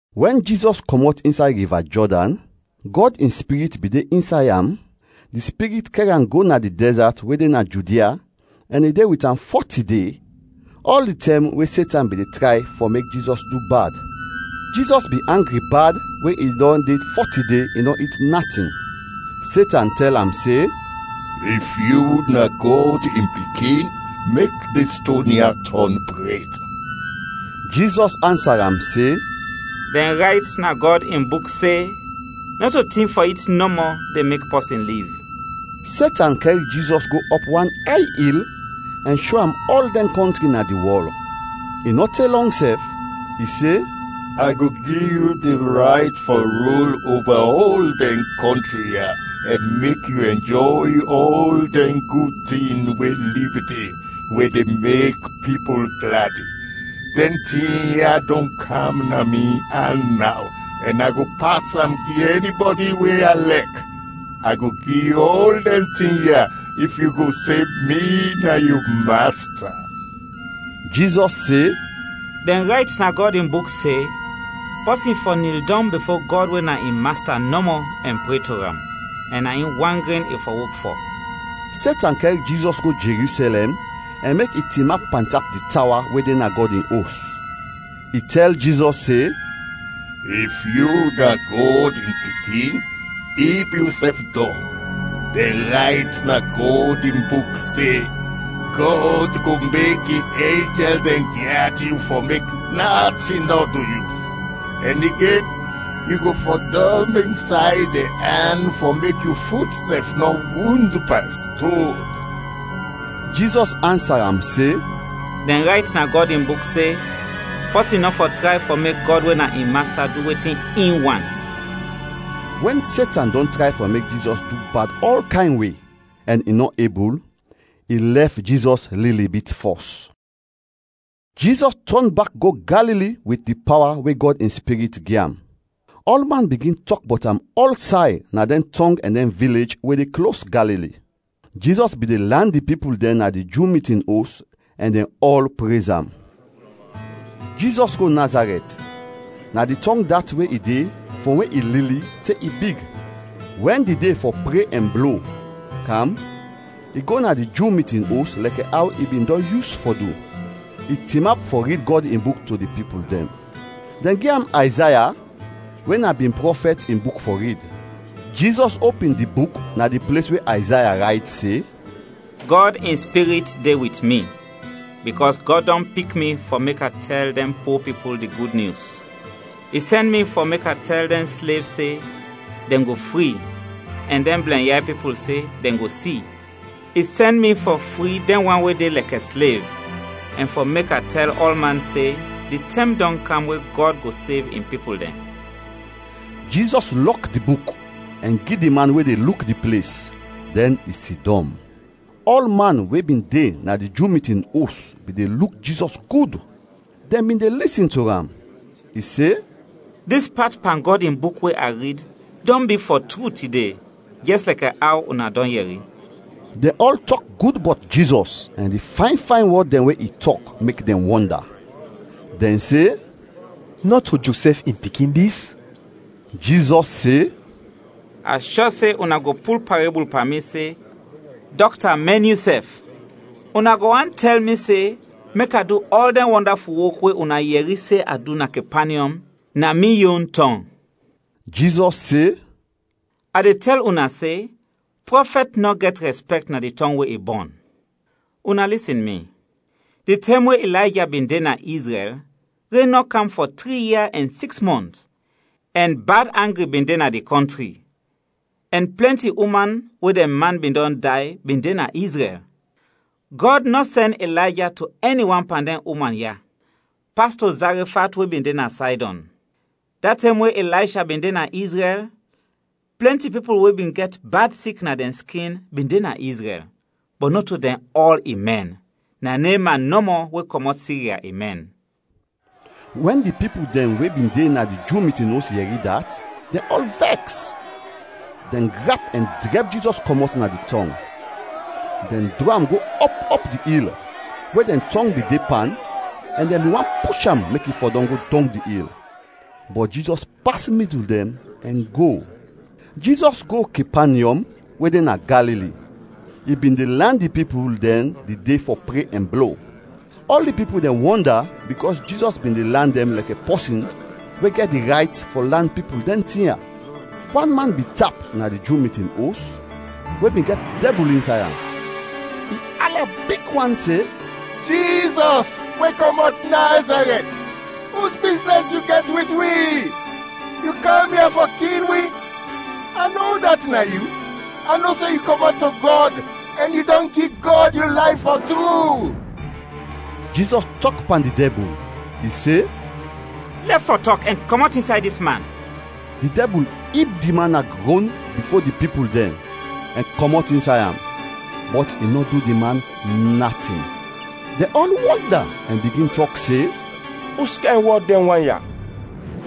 Wɛn Jizɔs kɔmɔt insay Riva Jɔdan, Gɔd in Spirit bin de insay am, di Spirit kɛr am go na di dɛzat we de na Judia ɛn i de wit am fɔti de, ɔl di tɛm we Setan bin de tray fɔ mek Jizɔs du bad. Jizɔs bin angri bad we i dɔn de fɔti de, i nɔ it natin. Setan tɛl am se, “If yu na Gɔd in Pikin, mek dis ston ya tɔn bred.” Jizɔs ansa am se, “Dɛn rayt na Gɔd in Buk se nɔto tin fɔ it nɔmɔ de mek pɔsin liv.” Setan kɛr Jizɔs go ɔp wan ay il ɛn sho am ɔl dɛn kɔntri na di wɔl, i nɔ te lɔng sɛf. I se, “A go gi yu di rayt fɔ rul oba ɔl dɛn kɔntri ya ɛn mek yu ɛnjɔy ɔl dɛn gud tin we lib de we de mek pipul gladi. Dɛn tin ya dɔn kam na mi an naw ɛn a go pas am gi ɛnibɔdi we a lɛk. A go gi yu ɔl dɛn tin ya if yu go se mi na yu masta.” Jizɔs se, “Dɛn rayt na Gɔd in Buk se, ‘Pɔsin fɔ nil dɔng bifo Gɔd we na in Masta nɔmɔ ɛn pre to am, ɛn na in wan gren i fɔ wok fɔ.’” Setan kɛr Jizɔs go Jerusɛlɛm ɛn mek i tinap pantap di tawa we de na Gɔd in Os. I tɛl Jizɔs se, “If yu na Gɔd in Pikin, ib yusɛf dɔng. Dɛn rayt na Gɔd in Buk se, ‘Gɔd go mek in enjɛl dɛn gyad yu fɔ mek natin nɔ du yu,’ ɛn igen, ‘Yu go fɔdɔm insay dɛn an fɔ mek yu fut sɛf nɔ wund pan ston.’” Jizɔs ansa am se, “Dɛn rayt na Gɔd in Buk se, ‘Pɔsin nɔ fɔ tray fɔ mek Gɔd we na in Masta du wetin in want.’” Wɛn Setan dɔn tray fɔ mek Jizɔs du bad ɔl kayn we, ɛn i nɔ ebul, i lɛf Jizɔs lili bit fɔs. Jizɔs tɔn bak go Galili wit di pawa we Gɔd in Spirit gi am. Ɔlman bigin tɔk bɔt am ɔlsay na dɛn tɔng ɛn dɛn vilej we de klos Galili. Jizɔs bin de lan di pipul dɛn na di Ju mitin os ɛn dɛn ɔl prez am. Jizɔs go Nazarɛt. Na di tɔng dat we i de frɔm we i lili te i big. Wɛn di de fɔ pre ɛn blo, kam, i go na di Ju mitin os lɛkɛ aw i bin dɔn yus fɔ du. I tinap fɔ rid Gɔd in Buk to di pipul dɛn. Dɛn gi am Ayzaya we na bin prɔfɛt in buk fɔ rid. Jizɔs opin di buk na di ples we Ayzaya rayt se: “Gɔd in Spirit de wit mi, bikɔs Gɔd dɔn pik mi fɔ mek a tɛl dɛn po pipul di Gud Nyus. I sɛn mi fɔ mek a tɛl dɛn slev se dɛn go fri ɛn dɛn blɛnyay pipul se dɛn go si. I sɛn mi fɔ fri dɛn wan we de lɛkɛ slev, ɛn fɔ mek a tɛl ɔlman se di tɛm dɔn kam we Gɔd go sev in pipul dɛn.” Jizɔs lɔk di buk ɛn gi di man we de luk di ples; dɛn i sidɔm. Ɔlman we bin de na di Ju mitin os bin de luk Jizɔs gud, dɛn bin de lisin to am. I se, “Dis pat pan Gɔd in Buk we a rid, dɔn bi, fɔ tru, tide, jɛs lɛkɛ aw una dɔn yɛri.” Dɛn ɔl tɔk gud bɔt Jizɔs ɛn di fayn fayn wɔd dɛn we i tɔk mek dɛn wɔnda. Dɛn se, “Nɔto Josɛf in pikin dis?” Jizɔs se, “A shɔ se una go pul parebul pan mi se, ‘Dɔkta, mɛn yusɛf!’ Una go want tɛl mi se mek a du ɔl dɛn wɔndaful wok we una yɛri se a du na Kepanyɔm, na mi yon tɔng.” Jizɔs se, “A de tɛl una se prɔfɛt nɔ gɛt rɛspɛkt na di tɔng we i bɔn.” “Una lisin mi; di tɛm we Ilayja bin de na Izrɛl, ren nɔ kam fɔ tri ia ɛn siks mɔnt ɛn bad angri bin de na di kɔntri, ɛn plɛnti uman we dɛn man bin dɔn day bin de na Izrɛl. Gɔd nɔ sɛn Ilayja to ɛni wan pan dɛn uman ya, pas to Zarefat we bin de na Saydɔn. Da tɛm we Ilaysha bin de na Izrɛl, plɛnti pipul we bin gɛt bad sik na dɛn skin bin de na Izrɛl, bɔt nɔto dɛn ɔl i mɛn, na Neman nɔmɔ we kɔmɔt Sirya, i mɛn.” Wɛn di pipul dɛn we bin de na di Ju mitin os yɛri dat, dɛn ɔl vɛks. Dɛn grap ɛn drɛb Jizɔs kɔmɔt na di tɔng. Dɛn drɔ am go ɔp ɔp di il we dɛn tɔng bin de pan ɛn dɛn bin want push am mek i fɔdɔm go dɔng di il. Bɔt Jizɔs pas midul dɛn ɛn go. Jizɔs go Kepanyɔm we de na Galili. I bin de lan di pipul dɛn di de fɔ pre ɛn blo. Ɔl di pipul dɛn wɔnda bikɔs Jizɔs bin de lan dɛn lɛkɛ pɔsin we gɛt di rayt fɔ lan pipul dɛn tin ya. Wan man bin tap na di Ju mitin os we bin gɛt dɛbul insay am. I ala big wan se, “Jizɔs, we kɔmɔt Nazarɛt, us biznɛs yu gɛt wit wi? Yu kam ya fɔ kil wi? A no udat na yu, a no se yu kɔmɔt to Gɔd ɛn yu dɔn gi Gɔd yu layf fɔ tru.” Jizɔs tɔk pan di dɛbul. I se, “Lɛf fɔ tɔk ɛn kɔmɔt insay dis man!” Di dɛbul ib di man na grɔn bifo di pipul dɛn ɛn kɔmɔt insay am, bɔt i nɔ du di man natin. Dɛn ɔl wɔnda ɛn bigin tɔk se, “Uskayn wɔd dɛn wan ya?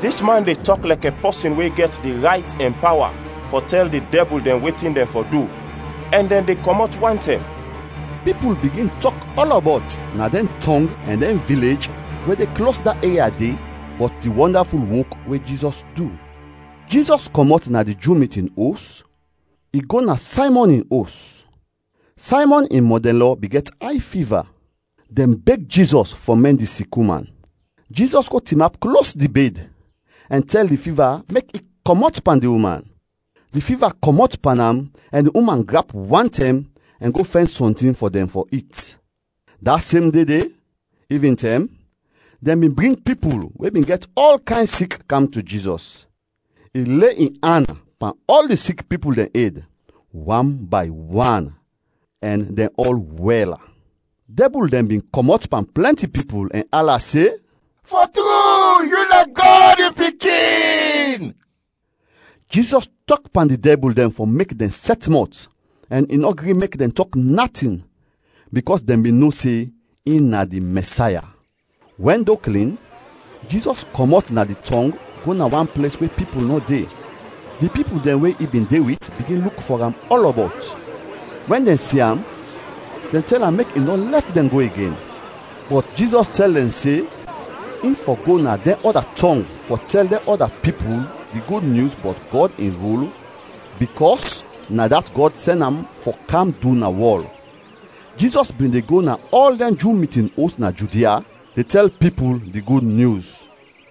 Dis man de tɔk lɛkɛ pɔsin we gɛt di rayt ɛn pawa fɔ tɛl di dɛbul dɛn wetin dɛn fɔ du ɛn dɛn de kɔmɔt wantɛm!” Pipul bigin tɔk ɔlɔbɔt na dɛn tɔng ɛn dɛn vilej we de klos da eria de bɔt di wɔndaful wok we Jizɔs du. Jizɔs kɔmɔt na di Ju mitin os, i go na Saymɔn in os. Saymɔn in mɔdɛnlɔ bin gɛt ay fiva. Dɛn beg Jizɔs fɔ mɛn di sik uman. Jizɔs go tinap klos di bed ɛn tɛl di fiva mek i kɔmɔt pan di uman. Di fiva kɔmɔt pan am ɛn di uman grap wantɛm ɛn go fɛn sɔntin fɔ dɛn fɔ it. Da sem de de, ivintɛm, dɛn bin bring pipul we bin gɛt ɔl kayn sik kam to Jizɔs. I le in an pan ɔl di sik pipul dɛn ed, wan bay wan, ɛn dɛn ɔl wɛl. Dɛbul dɛn bin kɔmɔt pan plɛnti pipul ɛn ala se, “Fɔ tru, yu na Gɔd in Pikin.” Jizɔs tɔk pan di dɛbul dɛn fɔ mek dɛn sɛt mɔt ɛn i nɔ gri mek dɛn tɔk natin, bikɔs dɛn bin no se in na di Mɛsaya. Wɛn do klin, Jizɔs kɔmɔt na di tɔng go na wan ples we pipul nɔ de. Di pipul dɛn we i bin de wit bigin luk fɔ am ɔlɔbɔt. Wɛn dɛn si am, dɛn tɛl am mek i nɔ lɛf dɛn go igen. Bɔt Jizɔs tɛl dɛn se in fɔ go na dɛn ɔda tɔng fɔ tɛl dɛn ɔda pipul di Gud Nyus bɔt Gɔd in rul bikɔs na dat Gɔd sɛn am fɔ kam du na wɔl. Jizɔs bin de go na ɔl dɛn Ju mitin os, na Judia, de tɛl pipul di Gud Nyus.